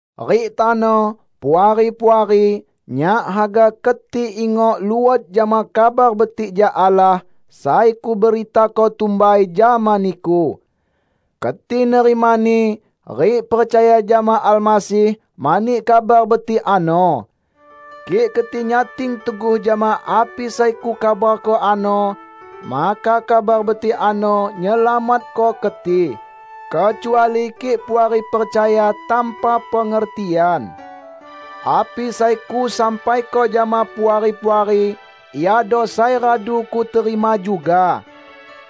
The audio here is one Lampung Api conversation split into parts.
Rik tano, Puari-puari, nyak haga keti ingok luot jama Kabar Betik jak Allah sai kuberitako tumbai jama niku. Keti nerimani, rik percaya jama Almasih mani Kabar Betik ano. Kik keti nyating teguh jama api sai kukabarko ano, maka Kabar Betik ano nyelamatko keti; kecuali kik Puari percaya tanpa pengertian. Api sai kusampaiko jama Puari-puari iado sai radu kuterima juga.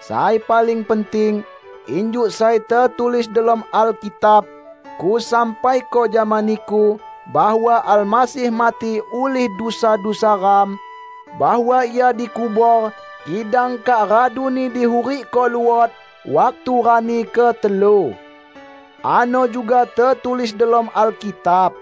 Sai paling penting, injuk sai tetulis delom Alkitab, kusampaiko jama niku bahwa Almasih mati ulih dusa-dusa ram; bahwa Ia dikubor, kidang kak raduni dihurikko luot waktu rani ketelu. Ano juga tetulis delom Alkitab.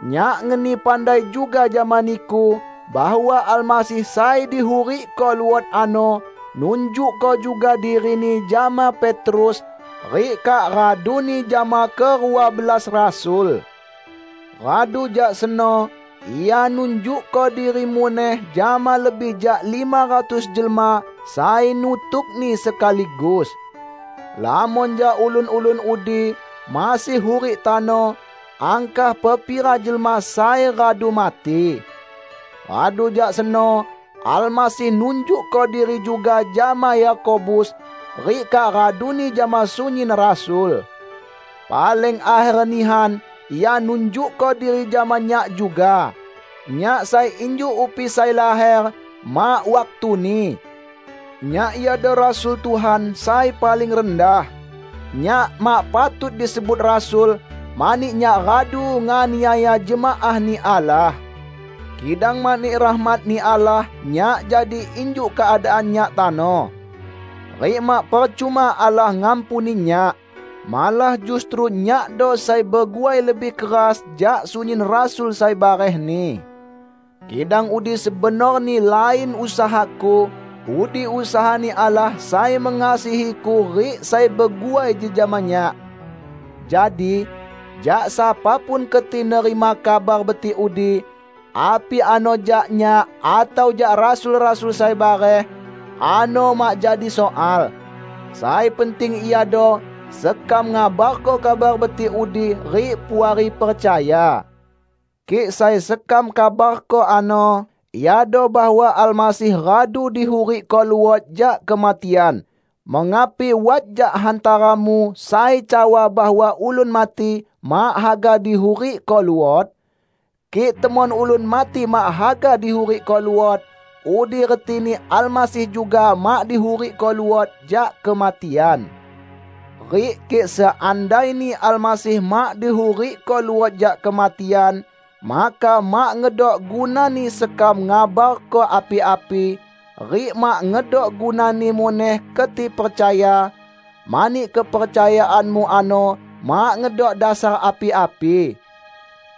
Nyak ngeni pandai juga jama niku bahwa Almasih sai dihurikko luot ano nunjukko juga diri-Ni jama Petrus, rik kak raduni jama kerua belas rasul. Radu jak seno Ia nunjukko diri muneh jama lebih jak lima ratus jelma sai nutuk-Ni sekaligus. Lamon jak ulun-ulun udi masih hurik tano, angkah pepira jelma sai radu mati. Radu jak seno Almasih nunjukko diri juga jama Yakobus rik kak raduni jama sunyin rasul. Paling akher nihan Ia nunjukko diri jama nyak juga -- nyak sai injuk upi sai laher mak waktuni! Nyak iado rasul Tuhan sai paling rendah. Nyak mak patut disebut rasul, mani nyak radu nganiaya jemaah-Ni Allah. Kidang mani rahmat-Ni Allah nyak jadi injuk keadaan nyak tano. Rik mak percuma Allah ngampuni nyak. Malah justru nyakdo sai beguai lebih keras jak sunyin rasul sai barehni. Kidang udi sebenorni lain usahaku; udi usaha-Ni Allah sai mengasihiku rik sai beguai jejama nyak. Jadi, jak sapa pun keti nerima Kabar Betik udi -- api ano jak nyak atau jak rasul-rasul sai bareh -- ano mak jadi soal. Sai penting iado sekam ngabarko Kabar betik udi rik Puari percaya. Kik sai sekam kabarko ano iado bahwa Almasih radu dihurikko luot jak kematian, mengapi wat jak hantaramu sai cawa bahwa ulun mati mak haga dihurikko luot? Kik temon ulun mati mak haga dihurikko luot, udi retini Almasih juga mak dihurikko luot jak kematian. Rik kik seandaini Almasih mak dihurikko luot jak kematian, maka mak ngedok gunani sekam ngabarko api-api rik mak ngedok gunani muneh keti percaya, mani kepercayaanmu ano mak ngedok dasar api-api.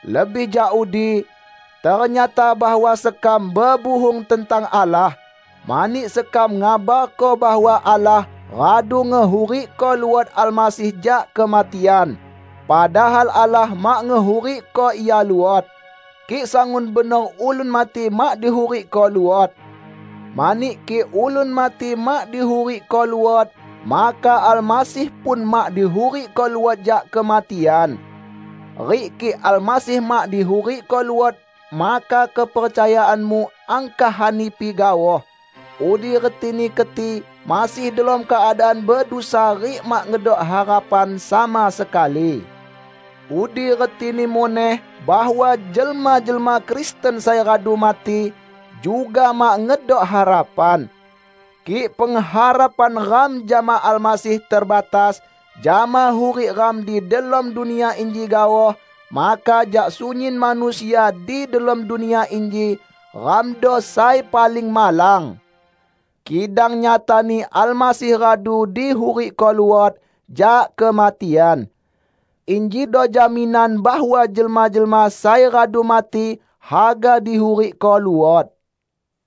Lebih jak udi, ternyata bahwa sekam bebuhung tentang Allah, mani sekam ngabarko bahwa Allah radu ngehurikko luot Almasih jak kematian, padahal Allah mak ngehurikko Ia luot -- kik sangun benor ulun mati mak dihurikko luot! Mani kik ulun mati mak dihurikko luot, maka Almasih pun mak dihurikko luot jak kematian. Rik kik Almasih mak dihurikko luot maka kepercayaanmu angkah hanipi gaoh; udi retini keti masih delom keadaan bedusa rik mak ngedok harapan sama sekali. Udi retini muneh bahwa jelma-jelma Kristen sai radu mati, juga mak ngedok harapan. Kik pengharapan ram jama Almasih terbatas jama hurik ram di delom dunia inji gaoh, maka jak sunyin manusia di delom dunia inji, ramdo sai paling malang! Kidang nyatani Almasih radu dihurikko luot jak kematian. Injido jaminan bahwa jelma-jelma sai radu mati haga dihurikko luot.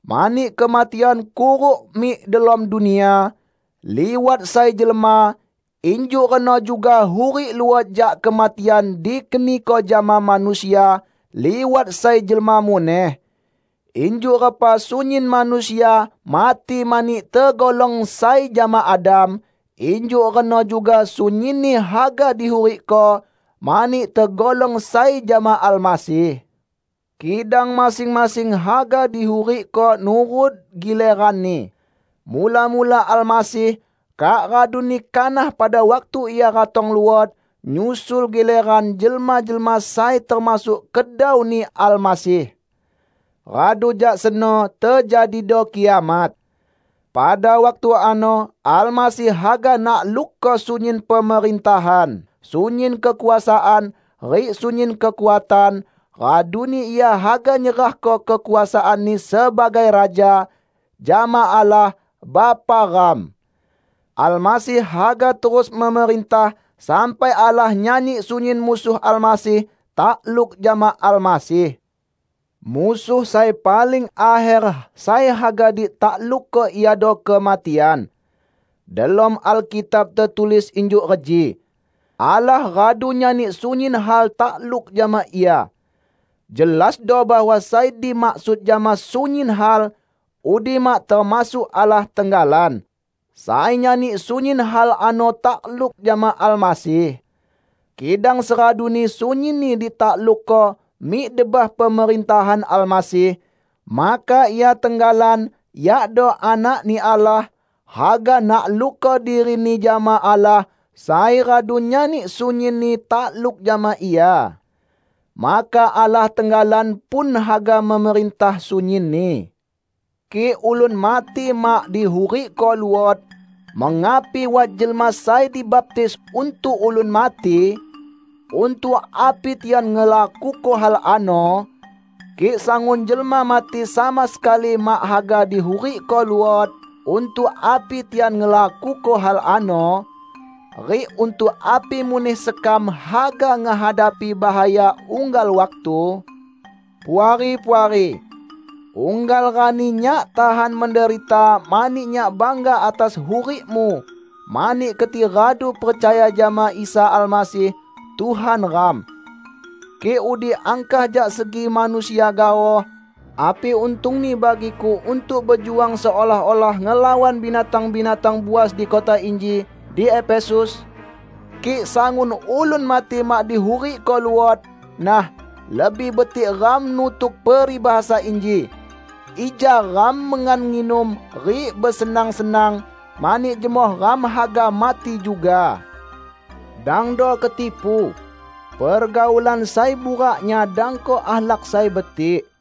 Mani kematian kuruk mik delom dunia, liwat sai jelma, injuk reno juga hurik luot jak kematian dikeniko jama manusia, liwat sai jelma muneh. Injuk repa sunyin manusia mati mani tegolong sai jama Adam, injuk reno juga sunyinni haga dihurikko, mani tegolong sai jama Almasih. Kidang masing-masing haga dihurikko nurut gileranni; mula-mula Almasih; kak raduni kanah pada waktu Ia ratong luot, nyusul gileran jelma-jelma sai termasuk kedau-Ni Almasih. Radu jak seno tejadido kiamat. Pada waktu ano Almasih haga naklukko sunyin pemerintahan, sunyin kekuasaan, rik sunyin kekuatan; raduni Ia haga nyerahko kekuasaan-Ni sebagai Raja, jama Allah, Bapa ram. Almasih haga terus memerintah sampai Allah nyani sunyin musuh Almasih takluk jama Almasih. Musuh sai paling akher sai haga ditaklukko iado kematian. Delom Alkitab tetulis injuk reji, "Allah radu nyani sunyin hal takluk jama Ia." Jelasdo bahwa sai dimaksud jama "sunyin hal" udi mak termasuk Allah tenggalan, sai nyani sunyin hal ano takluk jama Almasih. Kidang seraduni sunyinni ditaklukko mik debah pemerintahan Almasih, maka Ia tenggalan yakdo Anak-Ni Allah, haga naklukko diri-Ni jama Allah sai radu nyani sunyinni takluk jama Ia. Maka Allah tenggalan pun haga memerintah sunyinni. Kik ulun mati mak dihurikko luot, mengapi wat jelma sai dibaptis untuk ulun mati? Untuk api tian ngelakuko hal ano? Kik sangun jelma mati sama sekali mak haga dihurikko luot, untuk api tian ngelakuko hal ano? Rik untuk api muneh sekam haga ngehadapi bahaya unggal waktu? Puari-puari! Unggal rani nyak tahan menderita mani nyak bangga atas hurikmu mani keti radu percaya jama Isa Almasih, Tuhan ram. Kik udi angkah jak segi manusia gaoh, api untungni bagiku untuk bejuang seolah-olah ngelawan binatang-binatang buas di kota inji, di Efesus? Kik sangun ulun mati mak dihurikko luot, nah, lebih betik ram nutuk peribahasa inji: "Ija ram mengan-nginum rik besenang-senang, mani jemoh ram haga mati juga." Dangdo ketipu! Pergaulan sai burak nyadangko akhlak sai betik.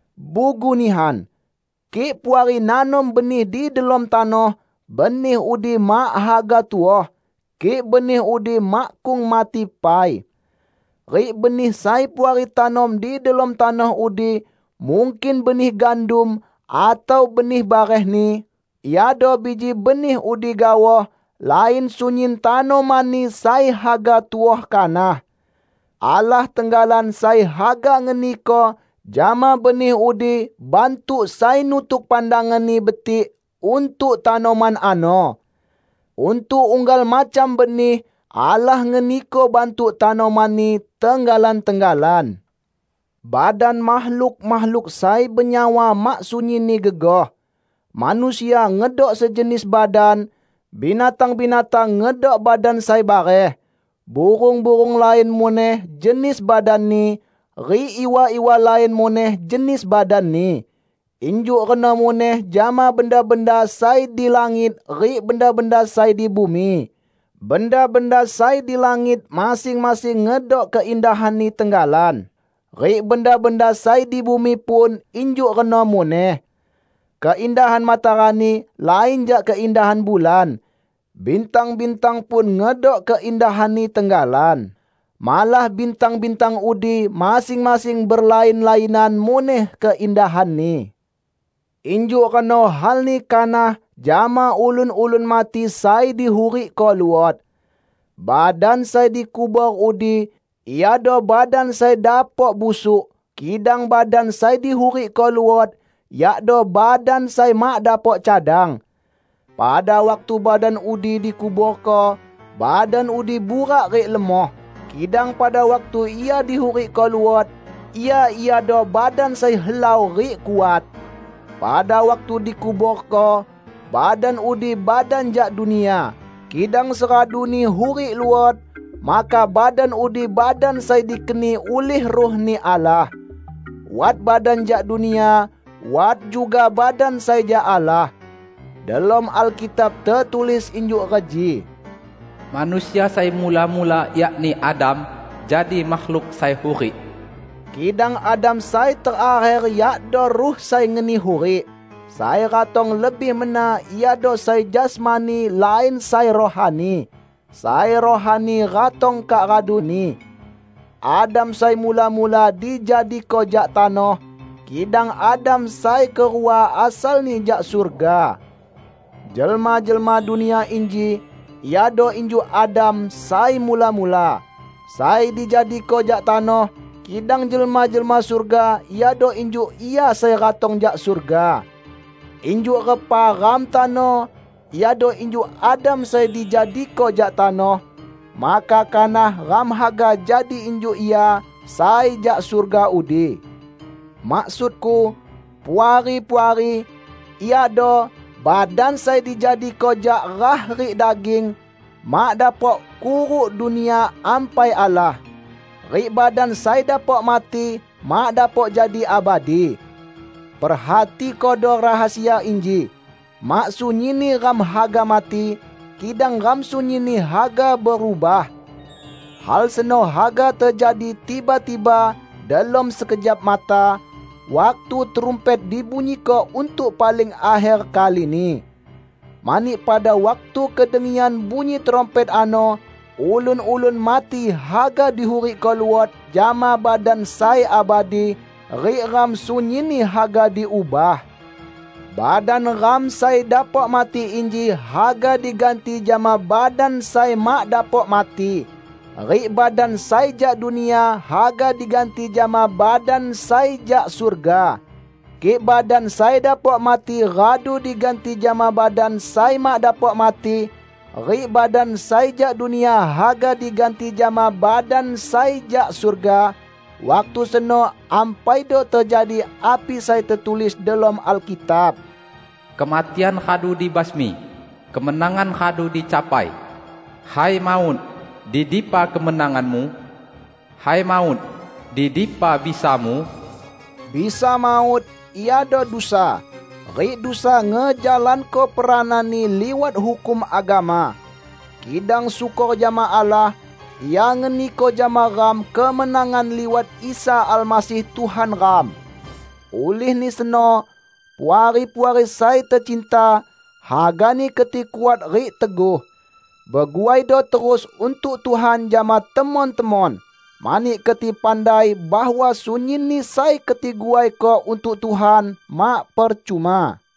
Bugu nihan! Kik Puari nanom benih di delom tanoh, benih udi mak haga tuoh, kik benih udi makkung mati pai. Rik benih sai Puari tanom di delom tanoh udi -- mungkin benih gandum atau benih barehni -- iado biji benih udi gaoh, lain sunyin tanomanni sai haga tuoh kanah. Allah tenggalan sai haga ngeniko jama benih udi bantuk sai nutuk pandangan-Ni betik untuk tanoman ano. Untuk unggal macam benih, Allah ngeniko bantuk tanomanni tenggalan-tenggalan. Badan makhluk-makhluk sai benyawa mak sunyinni gegoh. Manusia ngedok sejenis badan, binatang-binatang ngedok badan sai bareh; burung-burung lain muneh jenis badanni, rik iwa-iwa lain muneh jenis badanni. Injuk reno muneh jama benda-benda sai di langit rik benda-benda sai di bumi. Benda-benda sai di langit masing-masing ngedok keindahanni tenggalan, rik benda-benda sai di bumi pun injuk reno muneh. Keindahan matarani lain jak keindahan bulan. Bintang-bintang pun ngedok keindahanni tenggalan. Malah bintang-bintang udi masing-masing berlain-lainan muneh keindahanni. Injuk reno halni kanah jama ulun-ulun mati sai dihurikko luot. Badan sai dikubor udi iado badan sai dapok busuk, kidang badan sai dihurikko luot, yakdo badan sai mak dapok cadang. Pada waktu badan udi dikuborko, badan udi burak rik lemoh; kidang pada waktu ia dihurikko luot, ia iado badan sai helau rik kuat. Pada waktu dikuborko, badan udi badan jak dunia; kidang seraduni hurik luot, maka badan udi badan sai dikeni ulih Ruh-Ni Allah. Wat badan jak dunia, wat juga badan sai jak Allah. Delom Alkitab tetulis injuk reji, "Manusia sai mula-mula, yakni Adam, jadi makhluk sai hurik," kidang Adam sai terakher yakdo Ruh sai ngeni hurik. Sai ratong lebih mena iado sai jasmani, lain sai rohani. Sai rohani ratong kak raduni. Adam sai mula-mula dijadiko jak tanoh, kidang Adam sai kerua asalni jak surga. Jelma-jelma dunia inji iado injuk Adam sai mula-mula, sai dijadiko jak tanoh, kidang jelma-jelma surga iado injuk Ia sai ratong jak surga. Injuk repa ram tano iado injuk Adam sai dijadiko jak tanoh, maka kanah ram haga jadi injuk Ia sai jak surga udi. Maksudku, Puari-puari, iado: badan sai dijadiko jak rah rik daging, mak dapok kuruk Dunia Ampai Allah; rik badan sai dapok mati mak dapok jadi abadi. Perhatikodo rahasia inji: Mak sunyinni ram haga mati, kidang ram sunyinni haga berubah. Hal seno haga tejadi tiba-tiba delom sekejap mata, waktu trumpet dibunyiko untuk paling akher kalini. Mani pada waktu kedengian bunyi trumpet ano, ulun-ulun mati haga dihurikko luot jama badan sai abadi, rik ram sunyinni haga diubah. Badan ram sai dapok mati inji haga diganti jama badan sai mak dapok mati, rik badan sai jak dunia haga diganti jama badan sai jak surga. Kik badan sai dapok mati radu diganti jama badan sai mak dapok mati, rik badan sai jak dunia haga diganti jama badan sai jak surga, waktu seno ampaido tejadi api sai tetulis delom Alkitab, "Kematian radu dibasmi; kemenangan radu dicapai!" "Hai maut, di dipa kemenanganmu? Hai maut, di dipa bisamu?" Bisa maut iado dusa, rik dusa ngejalanko perananni liwat hukum agama. Kidang syukor jama Allah; Ia ngeniko jama ram kemenangan liwat Isa Almasih Tuhan ram! Ulihni seno, Puari-puari sai tecinta, hagani keti kuat rik teguh. Beguaido terus untuk Tuhan jama temon-temon, mani keti pandai bahwa sunyinni sai keti guaiko untuk Tuhan, mak percuma.